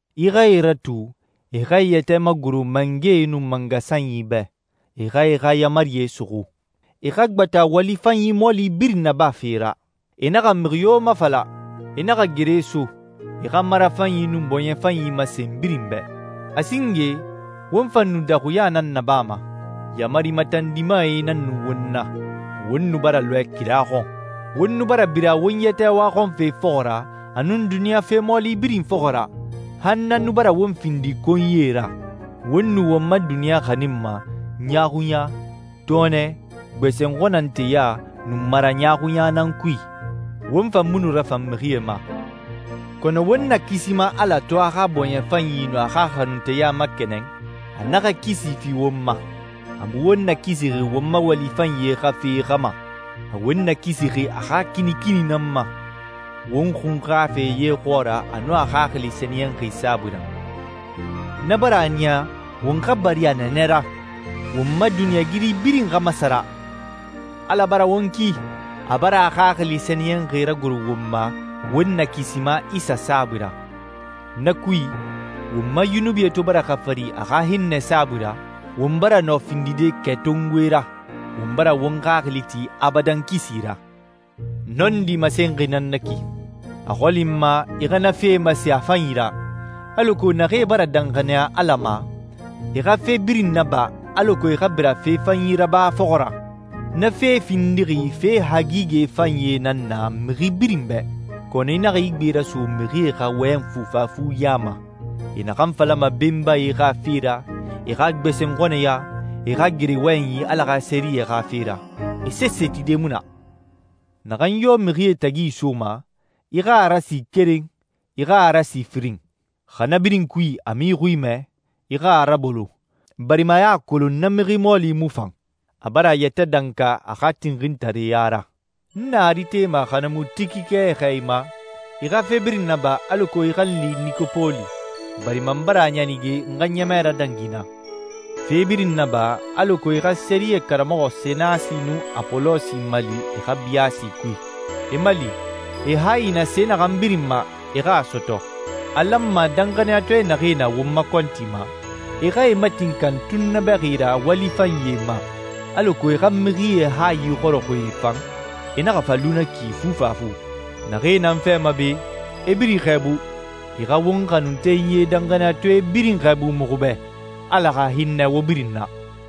I xa e ratu, e xa e yɛtɛ magoro mangɛe nun mangasanyi bɛ, e xa e xa yaamarie suxu. E xa gbata wali fanyi mɔɔli birin nabafe ra, e naxa mixi yo mafala, e naxa gere so, e xa marafanyi nun bɔɲɛ fanyi masen birin bɛ. A singe won fan nu daxuɲa nan nabama. Yaamari matandimae nan nu won na. Won nu bara lɔɛ kira xɔn. Won nu bara bira won yɛtɛ waxɔnfe fɔxɔ ra a nun duniɲa fe mɔɔli birin fɔxɔ ra, han na nu bara won findi konyie ra. Won nu won ma duniɲa xaninma ɲaaxuɲa, tɔɔnɛ, gbɛsɛnxɔnnanteya, nun maraɲaaxuɲa nan kui. Won fan mu nu rafan mixie ma. Kɔnɔ won Nakisima Ala to a xa bɔɲɛ fanyi nun a xa xanunteya makɛnɛn, a naxa kisi fi won ma. A mu won nakisixi won ma wali fanyie xa fe xa ma, a won nakisixi a xa kinikini nan ma, won xunxafe ye xɔɔra a nun a Xaxili Sɛniyɛnxi saabui ra. Na bara a niya won xa bari a nɛɛnɛ ra, won ma duniɲɛigiri birin xa masara. Ala bara won ki! A bara a Xaxili Sɛniyɛnxi ragoro won ma won Nakisima Isa saabui ra. Na kui, won ma yunubie to bara xafari a xa hinnɛ saabui ra, won bara nɔ findide kɛtongoe ra, won bara won xaxili ti abadan kisi ra. Nɔndi masenxi nan na ki. A xɔli n ma i xa na fee masen a fanyi ra, alako naxee bara danxaniya Ala ma, e xa fe birin naba alako e xa bira fe fanyi raba fɔxɔ ra. Na fee findixi fe hagigɛ fanyie nan na mixi birin bɛ. Kɔnɔ i naxa i gbe raso mixie xa wɔyɛn fufafu ya ma. E naxan falama benbae xa fe ra, e xa gbɛsɛnxɔnnɛya, e xa gere wɔyɛnyi Ala xa sɛriyɛ xa fe ra, e sese tide mu na. Naxan yo mixie tagi isoma, i xa a rasi keren, i xa a rasi firin. Xa na birin kui a mu i xui mɛ, i xa a rabolo, barima i a kolon a na mixi mɔɔli mu fan. A bara a yɛtɛ danka a xa tinxintareya ra. N na Aritema xa na mu Tikike xɛɛ i ma, i xa fe birin naba alako i xa n li Nikopoli, barima n bara a ɲanige n xa ɲɛmɛ radangi naa. Fe birin naba alako i xa sɛriyɛ karamɔxɔ Senasi nun Apolosi mali e xa biyaasi kui. E mali, e hayi na se naxan birin ma, e xa a sɔtɔ. A lanma danxaniyatɔɛ naxee na won ma kɔnti ma, e xa e matinkan tunnabɛxi ra wali fanyie ma, alako e xa mixie hayi xɔrɔxɔɛe fan, e naxa fa lu na ki fufafu. Naxee na n fɛ ma be, e birin i xɛɛbu. I xa won xanuntenyie danxaniyatɔɛe birin xɛɛbu muxu bɛ. Ala xa hinnɛ wo birin na.